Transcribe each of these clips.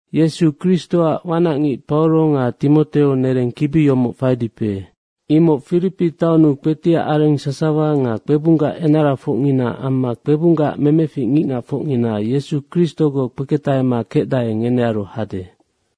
Yesu Kristoac wanacngic Pauro nga Timoteo, nereng kibi yomoc faidipe, imoc Firipi taonnu kpetiac areng sasawa nga kpebunggac enarafocngina amma kpebunggac memefic ngicngacfocngina Yesu Kristogoc kpeketahema kecdae, ngenearu hade.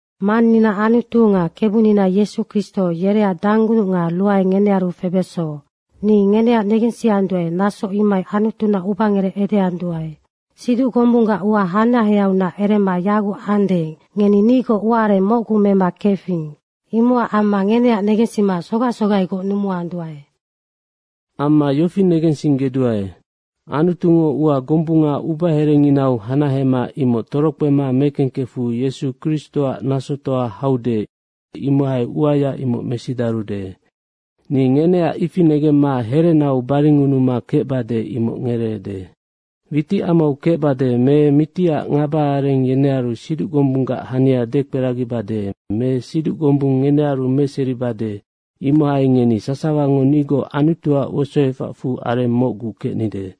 Mannina Anutu nga Kebunina Yesu Kristo yereac danggunuc nga ruae ngenearu febeso. Ni ngeneac negensianduae, naso imohai Anutuna ubangerec edeanduae. Siduc gombunggac ua hanaheaiunac erema yaguc ande, ngeni nigoc ua areng mocgu mema kefing, imocac amma ngeneac negensima sogac sogaigoc numuanduae. Amma yofi negensinggeduae, Anutungo ua gombunga ubaherenginau hanahema imoc torokpema mekengkefu Yesu Kristoac nasotoa hau, imohai uaya imoc mesidarude. Ni ngeneac ifi negemma herenau baringunuma kecbade imoc ngereede. Witicamau kecbade me mitiac ngabaareng yenearu siduc gombunggac hania dekperagibade me siduc gombung ngenearu meseribade imohai ngeni sasawango nigoc Anutuac wosoefacfu areng mocgu kecnide.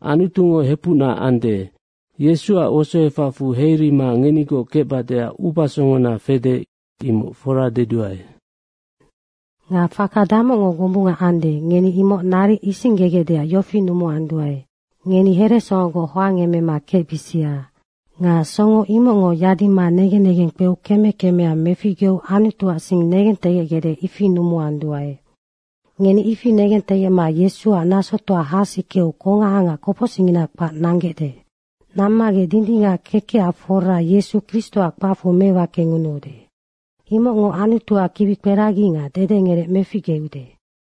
Anutungo hepucna kecde. Yesuac wosoefacfu heirima ngenigoc kecbadeac ubasongona fede, imoc fora deduae. Nga faka damocngo gombunga ande, ngeni imoc naric isinggegecdeac yofi numuanduae, ngeni heresongogoc hoangemema kecbisia. Nga songo imocngo yadima negen negeng kpeu keme kemea meficgeu Anutuac sing negentegecgecde, ifi numuanduae. Ngeni ifi negentegecma Yesuac nasotoa hasikeu kongaha nga kopocsicngina kpac nanggecde. Nammagec dindingac kekecac fora Yesu Kristoac kpacfu mewakengunuude. Imocngo Anutuac kibikperagi nga dedengerec meficgeude.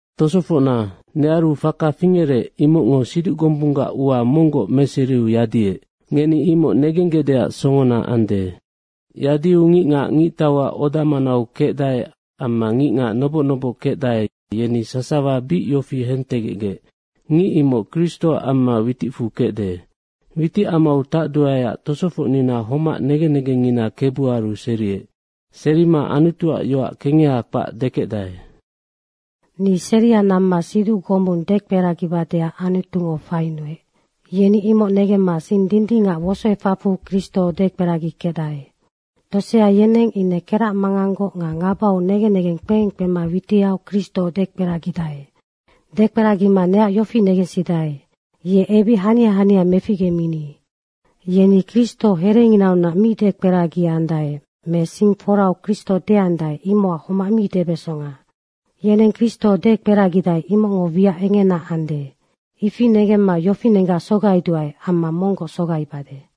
Tosofocna, nearu faka fingerec, imocngo siduc gombunggac ua monggoc meseriu yadiec. Ngeni imoc negenggecdeac songona ande. Yadiu ngicngac ngictauac oda manau kecdae amma ngicngac noboc noboc kecdae, yeni sasawa bic yofi hentegecgec, “Ngic imoc Kristoac amma witicfu kecde.” Witicamau tacduaeac tosofocnina homac negen negengngina Kebuaru seriec. Serima Anutuac yoac kengeha kpac dekecdae. Ni seria namma siduc gombung dekperagibadeac Anutungo fainuec, yeni imoc negemma sing dindingac wosoefacfu Kristo dekperagikecdae. Tosea yeneng ine keracmanganggoc nga ngabau negen negeng kpeengkpema witiau Kristo dekperagidae. Dekperagima neac yofi negensidae: Ye ebic hania hania meficgeminide. Yeni Kristo herenginaunac mi dekperagiandae me sing forau Kristo deandae, imocac homac mi debesonga, yeneng Kristo dekperagidae, imocngo wiac engena ande. Ifi negemma yofinenggac sogaiduae amma monggoc sogaibade.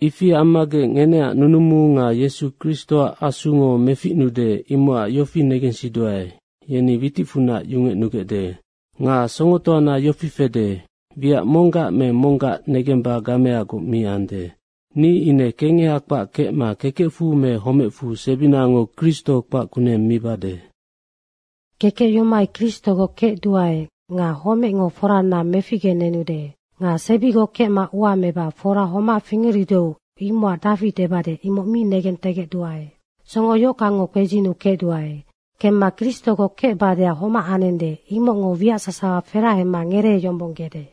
Ifi ammagec ngeneac nunumu nga Yesu Kristoac Asungo meficnude, imocac yofi negensiduae, witicfunac yungecnugecde. Nga songotoana yofi fede, wiac monggac me monggac negemba gameagoc mi ande. Ni ine kengeha kpac kecma kekecfu me homecfu sebinango Kristo kpac kuneng mibade. Kekec yomohai Kristogoc kecduae nga homecngo forana meficgenenude. Nga sebigoc kecma ua meba fora homac fingerudeu imocac dafi debade, imoc mi negentegecduae. Songo yohockangngo kpedzinuu kecduae. Kemma Kristogoc kecbadeac homac anende, imocngo wiac sasawa ferahema ngereeyombonggede.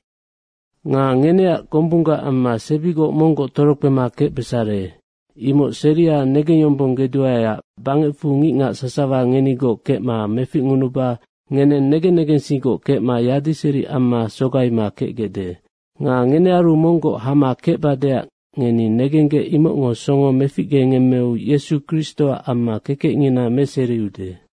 Nga ngeneac gombunggac amma sebigoc monggoc torokpema kecbesare. Imoc seria negengyombonggeduaeac bangecfu ngicngac sasawa ngenigoc kecma meficngunuba ngeneng negen negensinggoc kecma yadiseri amma sogaima kecgecde. Nga ngenearu monggoc hama kecbadeac ngeni nenggec imocngo songo meficgengemmeu Yesu Kristoac amma kekecngina meseriude.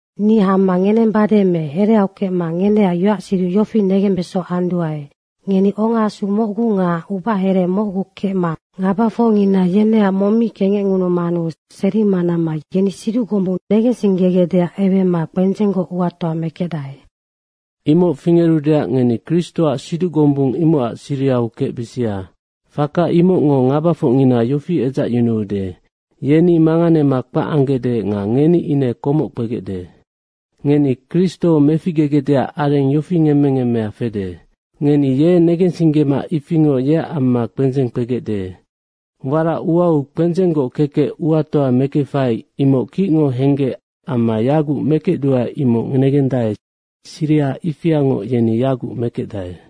Ni hama ngenembade me hereau kecma ngeneac yoacsiduc yofi negembeso anduae, ngeni ongaasu mocgu nga ubahere mocgu kecma ngabafocngina yeneac mong mi kengecngunumanu serima namma yeni siduc gombung negensinggegecdeac ewema kpendzenggoc uatoa mekecdae. Imoc fingerudeac ngeni Kristoac siduc gombung imocac sirihau kecbisia. Faka imocngo ngabafocngina yofi edzacyunuude: Yeni manganema kpac anggecde nga ngeni ine komoc kpegecde. Ngeni Kristo meficgegecdeac areng yofi ngemme ngemmea fede: Ngeni ye negensinggema ifingoc yeac amma kpendzeng kpegecde. Warac uau kpendzenggoc kekec uatoa mekefai imoc kicngo henggec amma yaguc mekecduae imoc negendae, siriha ifiangoc ngeni yaguc mekecdae.